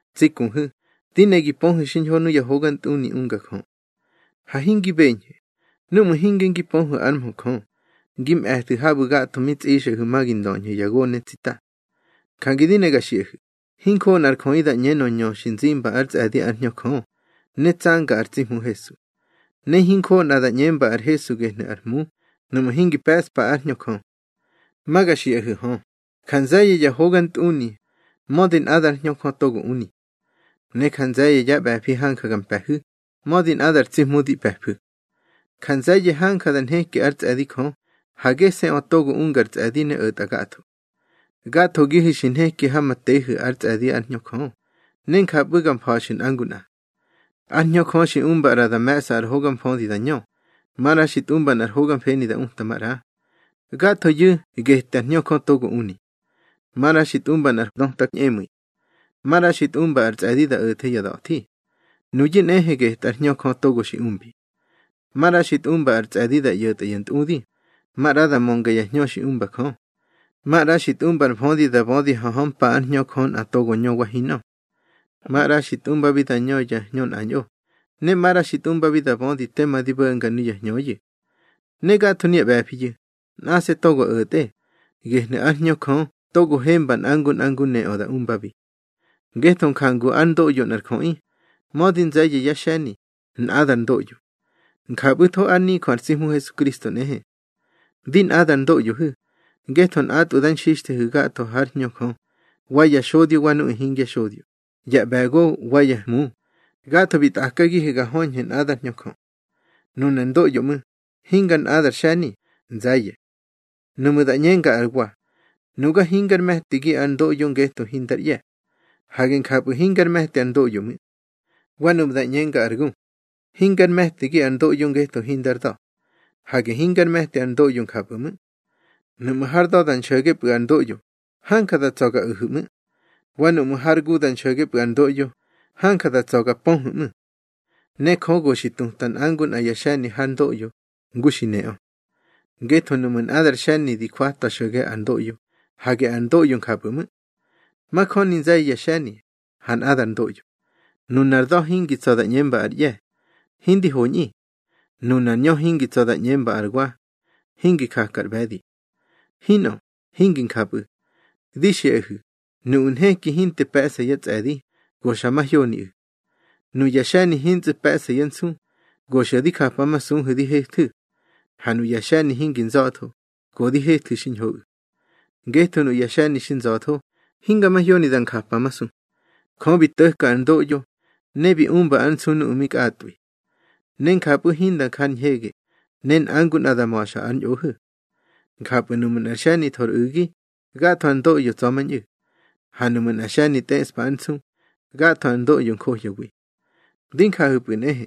Tsi kuhu̱, di ne gi pöhu̱ xiñho nuya hogantꞌuni unga Jö. Ha hingi beñhu̱, núꞌmu̱ hinge ngi pöhu̱ ár mhö Jö, ngi mꞌe̱thu̱ habu̱ gatho mi tsꞌixꞌahu̱ ma ngi ndöñhu̱ ya gone tsita. Jange di ne ga xiꞌahu̱, hinjoꞌo nꞌar jöꞌi da ꞌñenö ñö xi nzimba ár tsꞌe̱di ár Hñö Jö, ne tsanga ar tsi Hmu Hesu. Ne hinjoꞌo nꞌa da ꞌñemba ar Hesu gehnu̱ ar Hmu, nuꞌmu̱ hingi pe̱ꞌspa ár Hñö Jö. Ma ga xiꞌahu̱ hö, ja nze̱ye̱ ya hogantꞌuni, mödi nꞌadár Hñö Jö togo uni. Ne ja nze̱ye̱ ya ꞌbe̱fi hanja ga mpe̱hu̱, mödi nꞌadar tsi Hmu di pe̱fu̱. Ja nze̱ye̱ hanja nheki ár tsꞌe̱di Jö, ha gese̱ꞌö togo ungar tsꞌe̱di ne o̱tꞌa gatho. Gathogihu̱ xi nheki ha ma tehu̱ ár tsꞌe̱di ár Hñö Jö, ne njapꞌu̱ ga mfa̱xu̱ nꞌa ngu nꞌa. Ár Hñö Jö xi umba ꞌra da me̱ꞌsa ar hoga mfödi da ñö, maꞌra xi tꞌumba nꞌar hoga mfeni da uta maꞌra. Gathoyu̱ getꞌár Hñö Jö togo uni. Maꞌra xi tꞌumba nꞌar döta ñꞌemu̱i, maꞌra xi tꞌumba ar tsꞌe̱di da o̱the ya da̱thi. Nuyu̱ nꞌehe getꞌár Hñö Jö togo xi umbi. Maꞌra xi tꞌumba ar tsꞌe̱di da ꞌyo̱tꞌa ya ntꞌudi, maꞌra da mönga ya hñö xi umba Jö. Maꞌra xi tꞌumba ar mfödi da bödi ha hömpa ár Hñö Jö nꞌa togo ñö wa hinꞌö. Maꞌra xi tꞌumbabi da ñö ya hñö nꞌañꞌo, ne maꞌra xi tꞌumbabi da bödi tema di bo̱nga nuya hñöꞌu̱. Ne gatho nuya ꞌbe̱fiyu̱, nꞌase̱ togo o̱tꞌe, gehnu̱ ár Hñö Jö togo hemba nꞌa ngu nꞌa ngu neꞌö da umbabi. Ngetho njangu ár ndoꞌyo nꞌar jöꞌi, mödi nze̱ye̱ yá xe̱ni, nꞌadar ndoꞌyo. Njapꞌu̱tho ár nijö ar tsi Hmu Hesukristo nꞌehe. Di nꞌadar ndoꞌyohu̱, ngetho nꞌatꞌwu̱ da nxixthehu̱ gatho hár Hñö Jö, wa ya xodyo wa nuꞌu̱ hingya xodyo, ya ꞌbe̱go wa ya hmu, gatho bi tꞌakagihu̱ ga höñhu̱ nꞌadár Hñö Jö. Nunar ndoꞌyo ꞌmu̱, hingi nꞌadar xe̱ni, nze̱ye̱. Nuꞌmu̱ da ꞌñenga ar wa: Nuga hingár me̱tigi ar ndoꞌyo ngetho hindar ꞌye̱. Hage njapꞌu̱ hingár me̱ti ar ndoꞌyo ꞌmu̱. Wa nuꞌmu̱ da ꞌñenga ar gu: Hingár me̱tigi ar ndoꞌyo ngetho hindar da̱. Hage hingár me̱ti ar ndoꞌyo njapꞌu̱ ꞌmu̱. Nuꞌmu̱ har da̱ da nxo̱gepꞌu̱ ar ndoꞌyo, hanja nda tsa̱ nga o̱hu̱ ꞌmu̱. Wa nuꞌmu̱ har gu nda nxo̱gepꞌu̱ ar ndoꞌyo, hanja nda tsa̱ nga mpöhu̱ ꞌmu̱. Ne Jö go xi tuta nꞌa ngu nꞌa ya xe̱ni har ndoꞌyo, ngu xi neꞌö. Ngetho nuꞌmu̱ nꞌadar xe̱ni di jwata xo̱ge ar ndoꞌyo, hage ar ndoꞌyo njapꞌu̱ ꞌmu̱. Majöni nze̱ye̱ ya xe̱ni, ha nꞌadar ndoꞌyo. Nunar da̱ hingi tsa̱ da ꞌñemba ar ꞌye̱: Hindi hoñꞌi. Nunar ñö hingi tsa̱ da ꞌñemba ar wa: Hingi jaka ar ꞌbe̱di. Hinꞌö, hingi njapꞌu̱. Di xiꞌahu̱, nuꞌu̱ nheki hinte pe̱ꞌsa yá tsꞌe̱di, go xa mahyoniꞌu̱. Nuya xe̱ni hintsꞌu̱ pe̱ꞌsa yá nsu, go xa di japamasuhu̱ di hethu̱. Ha nuꞌu̱ ya xe̱ni hingi nza̱tho, go di hethu̱ xiñhoꞌu̱. Ngetho nuꞌu̱ ya xe̱ni xi nza̱tho, hinga mahyoni da njapamasu. Jö bi to̱ka ar ndoꞌyo, ne bi umba ár nsu nuꞌu̱ mi kꞌatꞌwi. Ne njapꞌu̱ hinda nja ar ñhege, ne nꞌa ngu nꞌa da ma̱xa ár ñꞌohu̱. Njapꞌu̱ nuꞌmu̱ nꞌa xe̱ni tho ar u̱gi, gatho ar ndoꞌyo tsa̱mañꞌu̱. Ha nuꞌmu̱ nꞌa xe̱ni tꞌeꞌspa ár nsu, gatho ar ndoꞌyo johyawi. Di njahu̱pꞌu̱ nꞌehe.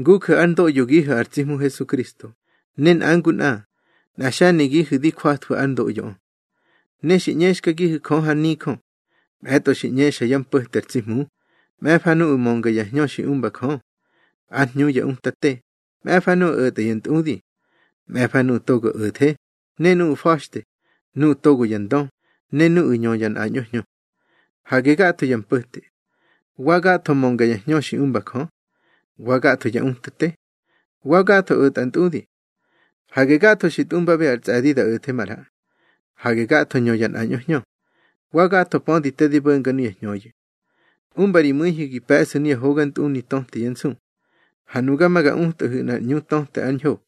Nguju̱ ár ndoꞌyogihu̱ ar tsi Hmu Hesukristo, ne nꞌa ngu nꞌa, nꞌa xe̱nigihu̱ di jwathwu̱ ár ndoꞌyoꞌö. Ne xi ꞌñexkagihu̱ Jö har nijö: Mꞌe̱tꞌo xi ꞌñexa yá mpo̱te ar tsi Hmu, mꞌe̱fa nuꞌu̱ mönga ya hñö xi umba Jö. Ár hñu ya utate, mꞌe̱fa nuꞌu̱ o̱tꞌa ya ntꞌudi. Mꞌe̱fa nuꞌu̱ togo o̱the, ne nuꞌu̱ fa̱xte, nuꞌu̱ togo ya ndö, ne nuꞌu̱ ñö ya nꞌañꞌo hñö. Hage gatho ya mpo̱te. Wa gatho mönga ya hñö xi umba Jö. Wa gatho ya utate. Wa gatho o̱tꞌa ya ntꞌudi. Hage gatho xi tꞌumbabi ar tsꞌe̱di da o̱the maꞌra. Hage gatho ñö ya nꞌañꞌo hñö. Wa gatho pödi te di bo̱nga nuya hñöyu̱. Umba ri mu̱ihu̱ gi pe̱ꞌsu̱ nuya hogantꞌuni töte yá nsu. Ha nuga ma ga utꞌahu̱ nꞌar ꞌñu töte ár ñho.